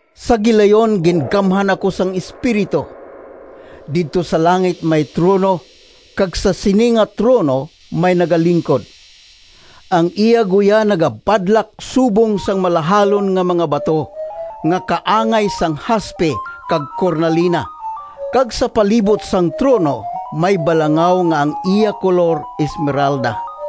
Sa gilayon gingamhan ako sang Espiritu. Didto sa langit may trono, kag sa sini nga trono may nagalingkod. Ang iya guya nagabadlak subong sang malahalon nga mga bato nga kaangay sang haspe kag kornalina, kag sa palibot sang trono may balangaw nga ang iya kolor esmeralda.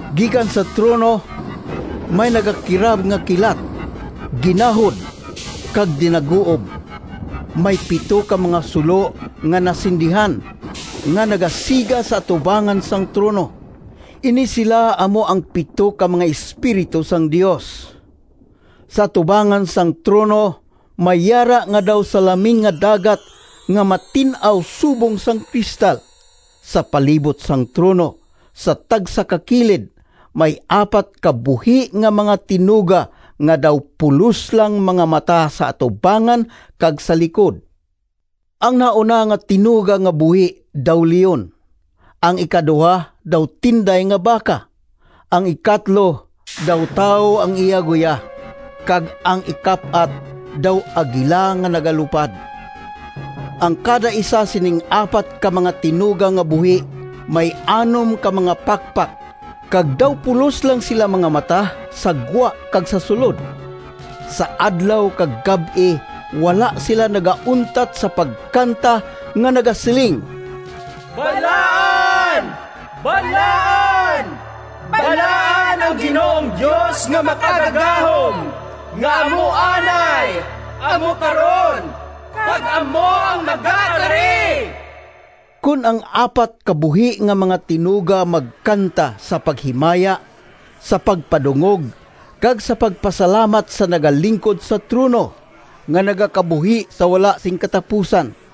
Gikan sa trono, may nagakirab nga kilat, ginahod, kag dinaguob. May pito ka mga sulo nga nasindihan, nga nagasiga sa atubangan sang trono. Ini sila amo ang pito ka mga espiritu sang Dios. Sa atubangan sang trono, may yara nga daw salaming nga dagat nga matin-aw subong sang kristal. Sa palibot sang trono, sa tagsa ka kilid, may apat ka buhi nga mga tinuga nga daw pulos lang mga mata sa atubangan kag sa likod. Ang nahauna nga tinuga nga buhi daw leon, ang ikaduha daw tinday nga baka, ang ikatlo daw tawo ang iya guya, kag ang ikap-at daw agila nga nagalupad. Ang kadaisa sining apat ka mga tinuga nga buhi may anom ka mga pakpak, kag daw pulos lang sila mga mata, sa gwa kag sa sulod. Sa adlaw kag gab-i wala sila nagauntat sa pagkanta nga nagasiling: “Balaan, balaan, balaan, Ang Ginoong Dios nga Makagagahom, Nga amo anay, amo karon, Kag amo ang magakari.” Kon ang apat ka buhi nga mga tinuga magkanta sa paghimaya, sa pagpadungog, kag sa pagpasalamat sa nagalingkod sa trono, nga nagakabuhi sa wala sing katapusan,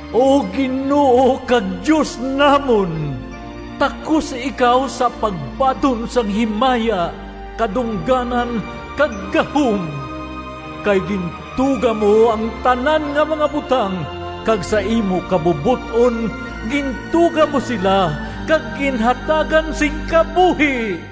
“O Ginoo kag Dios namon! Takos ikaw sa pagbaton Sang himaya, kadungganan, kag gahom. Kay gintuga mo Ang tanan nga mga butang, Kag sa imo kabubot-on Gintuga mo sila Kag ginhatagan sing kabuhi.”